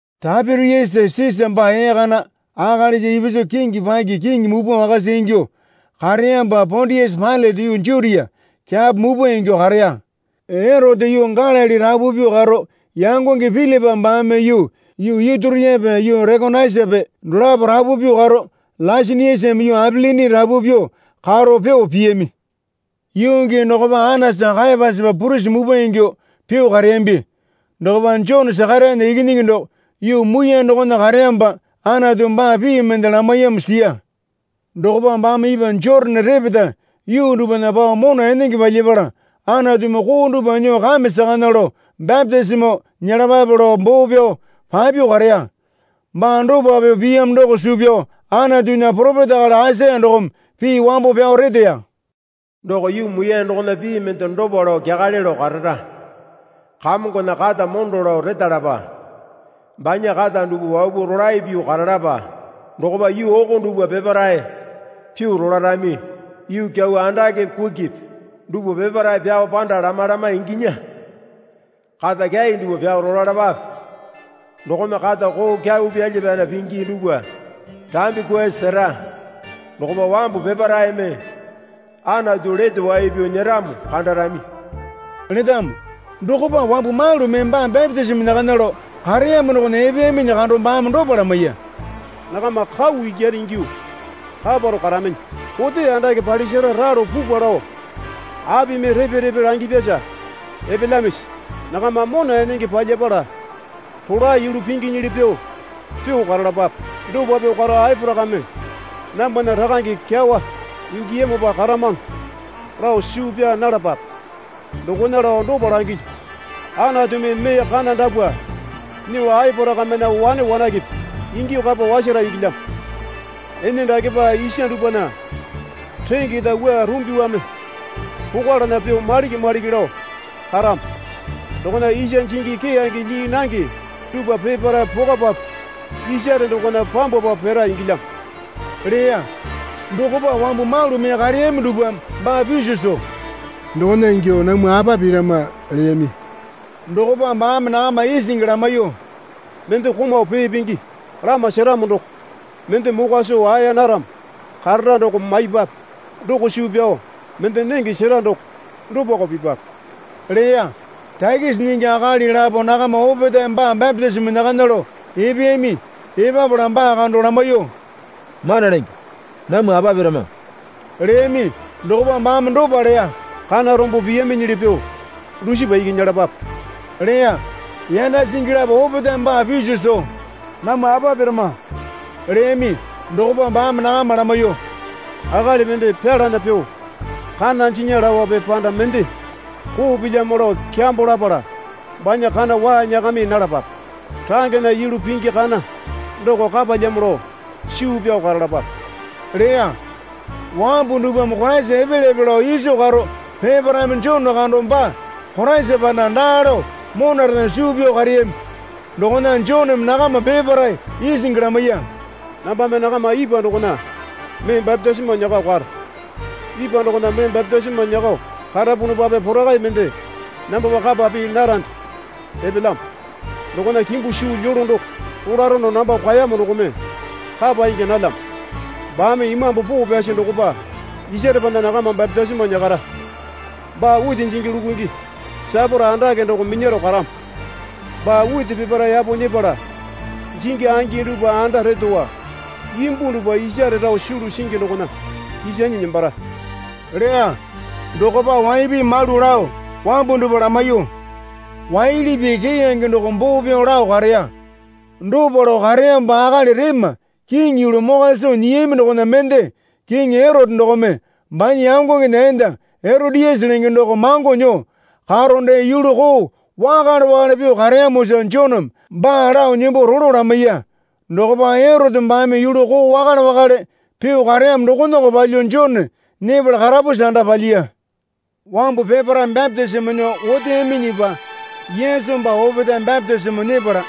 Taipiriasa Sisa baa ee kana akalisa ipisu kingi paki kiŋi mupwa wakasa ingyuo kareyamopa Pondiasa Pailate yuu Jutia kyapo muwpa ingyuo kareya. Eroteme yuu Galili rapu pyuo karo yangonge Pilipa baame yuu Ituriape yuu Rekonaitasape dolapo rapu pyuo karo Laisaniasame yuu Apilini rapu pyuo karo pyuo piyami. Yuu gii dokopa Anasa Kayapasapa purisi mupwa ingyuo pyuo kareyambi. Dokopa Jone Sakarayana ikinyingi doko yuu muiyane dokona kareyamopa Anatumi baa pii mende lamaiyamo siya. Dokopa baame ipwa Jotane repeta yuu dupwana pao mona enenge palyapala Anatumi koo dupwa nyuo kame sakana lao bapitisimo nyelapape, lao boo pyao papyuo kareya. Baa dopa pyuo piyamo doko suu pyao Anatunya poropeta akali Aisaya dokome pii wambo pyao reteya. Doko yuu muiyane dokona pii mende dopa lao kyakale lao karara. Kamongona kata mondo lao retalapa banya kata dupwa wapuo rolae pyuo karalapa. Dokopa yuu oko dupwa peparae pyuo rolarami. Yuu kyau andakepe kukipi dupwa peparae pyao panda lama lama inginya. Kata kyai dupwa pyao rolalapape dokome kata koo kyau pyalya pyana pingi dupwa rambi kwuasi sera. Dokopa wambu peparaeme Anatu lete wai pyao nyeramo kandarami, letamo. Dokopa wambu malu mee baa bapitisimo nyakana lao kareyamo dokona epeyaminyi kando baame dopa lamaiya. Nakama kau ikyane ingyuo kaparao karaminyi. Kote andake palisara ralo pupwa lao apimi repe repe langipyasa epelyamisi? Nakama mona enenge palyapala rolae yulu pinginyili pyuo pyuo karalapape. Dopa pyuo karo Aporakame namwana rakange kyawa ingiyamopa karamano lao suu pyaa nalapape. Dokona lao dopa langilyu. Anatumi mee kana dapwa nyuo Aporakamena wane wanakepe ingyuo kapa wasara ingilyamo. Ene dakepa isa dupwana rengeta wua rumbiwame pokwalana pyuo maliki maliki lao karamo. Dokona isa jingi keyange lyii nange dupwa peparae pokwapapu isare dokona pambwapa pira ingilyamo, leya. Dokopa wambu malu mee kareyami dupwame baa piso soo, Dokona ingyo namwa apa pirama? leyami. Dokopa baame nakama isingi lamaiyuo, Mende komau pee pingi lama seramo doko mende mokwa soo aeya naramo karara doko maipwape. Doko suu pyao mende nenge sera doko dopako pipwape leya. Takisi nyingi akali lapo nakama opetae baa bapitisimo nyakana lao epeyami. Epapala baa kando lamaiyuo, Mana Lenge, namwa apa pirama? leyami. Dokopa baame dopa leya. Kana rombo piyaminyili pyuo dusipa iki nyelapape, leya. Yanda singi lapo opetaeme baa piso soo, Namwa apa pirama? leyami. Dokopa baame nakama lamaiyuo, Akali mende pyalana pyuo kana jinya laope panda mende koo pilyamo lao kyambo lapala banya kana waa nyakami nalapape. Rangena yulu pingi kana doko kapalyamo lao suu pyao karalapape leya. Wambu dupwame Koraisa epelyape lao iso karo peparaeme Jone kando baa Koraisa panda daa lao monarena suu pyao kareyami. Dokona Joneme nakama peparae isingi lamaiya. Nambame nakama ipwa dokona mee bapitisimo nyakao karo. Ipwa dokona mee bapitisimo nyakao karapunupape Porakai mende nambapa kapa pii narande epelyamo dokona kimbu suu lyolo doko polarono namba kwaeyamo dokome kapa ingya nalyamo. Baame Imambu Poo Pyasi dokopa isarepana nakama bapitisimo nyakara. Baa witi jingi lukungi saporo andake doko minyaro karamo. Baa witi peparae yapo nyepala jingi angi dupwa anda retowa, imbu dupwa isare rao sulu singi dokona kisanyi nembara leya. Dokopa waipi malu lao wambu dupwa lamaiyuo waili pii keyange doko boo pyao lao kareya. Dopa lao kareyamopa akali rema kiŋi yulu mokwa soo nyiyami dokona mende kingi Erote dokome banya yangongena enda Eroteyase lenge doko mango nyuo karo dee yulu koo wakale wakale pyuo kareyamosa Joneme baa lao nembo rolo lamaiya. Dokopa Erote baame yulu koo wakale wakale pyuo kareyamo dokonako palyuo Jone nyepala karapusi anda palyiya. Wambu peparae bapitisimo nyuo oteyaminyipa Yesu baa opetae bapitisimo nyepala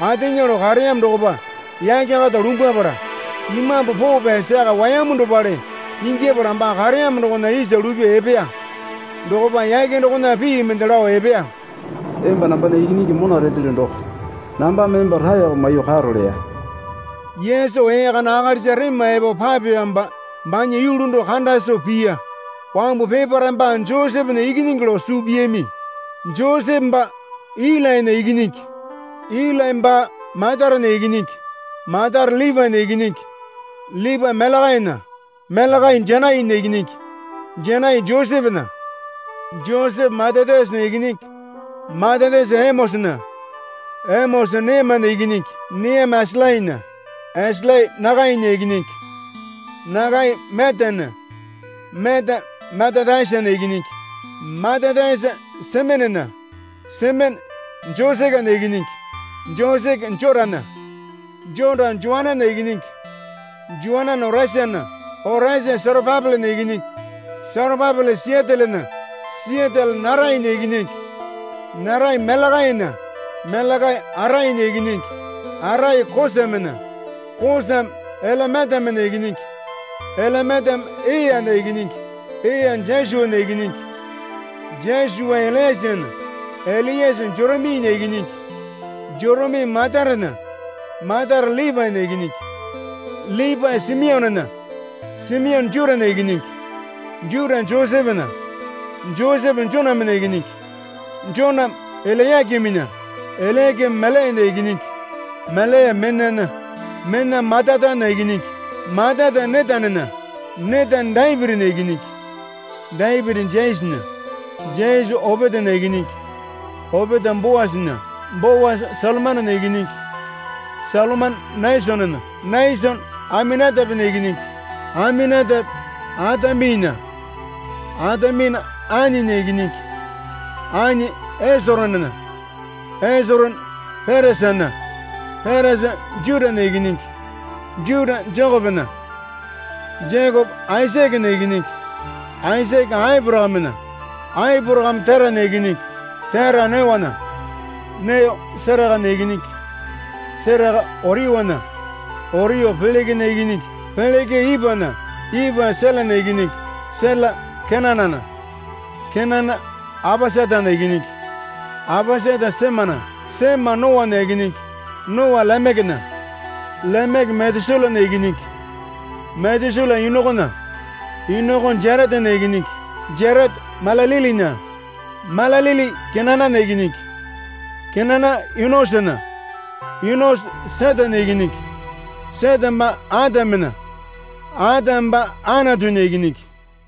ateŋa lao kareyamo dokopa yake kata lumbwapala Imambu Poo Pyasi yaka wayamu dopale ingyapala baa kareyamo dokona isa lupyuo epeya. Dokopa yake dokona pii mende lao epeya. Emba nambana Ikinyingi mona retelyo doko. Nambame emba raeko maiyuo karo, leya. Yesu ee kana akalisa rema epo papeyamopa banya yulu doko kanda soo piya. Wambu peparae baa Josepena ikinyingi lao suu piyami. Josepe baa Ilainya ikinyingi, Ilai baa Matatena ikinyingi, Matate Lipaena ikinyingi, Lipae Melekainya, Melekai Janainya ikinyingi, Janai Josepena, Josepe Matatayasana ikinyingi, Matatayasa Emosana, Emosa Neamena ikinyingi, Neame Esalainya, Esalai Nakainya ikinyingi, Nakai Meatana, Meata Matatayasana ikinyingi, Matatayasa Semenena, Semene Josekena ikinyingi, Joseke Jotana, Jota Joananena ikinyingi, Joanane Oresana, Oresa Serapapelena ikinyingi, Serapapele Siatielena, Siatiele Nerainya ikinyingi, Nerai Melekainya, Melekai Atainya ikinyingi, Atai Kosamena, Kosame Elemetamena ikinyingi, Elemetame Eana ikinyingi, Ea Josuana ikinyingi, Josua Eliasena, Eliase Joriminya ikinyingi, Jorimi Matatena, Matate Lipaena ikinyingi, Lipae Simionena, Simione Jutana ikinyingi, Juta Josepena, Josepe Jonamena ikinyingi, Joname Elayakiminya, Elayakimi Meliana ikinyingi, Melia Menana, Mena Matatana ikinyingi, Matata Netanena, Netane Dapitinya ikinyingi, Dapiti Jesena, Jese Opetana ikinyingi, Opeta Boasana, Boasa Salmanena ikinyingi, Salomane Nasonena, Nasone Aminatapena ikinyingi, Aminatape Ataminana, Atamina Aninya ikinyingi, Ani Esoronena, Esorone Peresana, Peresa Jutana ikinyingi, Juta Jekopena, Jekope Aisakena ikinyingi, Aisake Aporakamena, Aporakame Terana ikinyingi, Tera Neona, Neo Serakana ikinyingi, Seraka Oriunya, Oriu Pelekena ikinyingi, Peleke Ipana, Ipa Selana ikinyingi, Sela Kenanana, Kenana Apasatana ikinyingi, Apasata Semana, Sema Noana ikinyingi, Noa Lemekena, Lemeke Metusalana ikinyingi, Metusala Inokona, Inoko Jaretana ikinyingi, Jareta Malalilinya, Malalili Kenanana ikinyingi, Kenana Inosona, Inoso Setena ikinyingi, Sete baa Atamena, Atame baa Anatunya ikinyingi.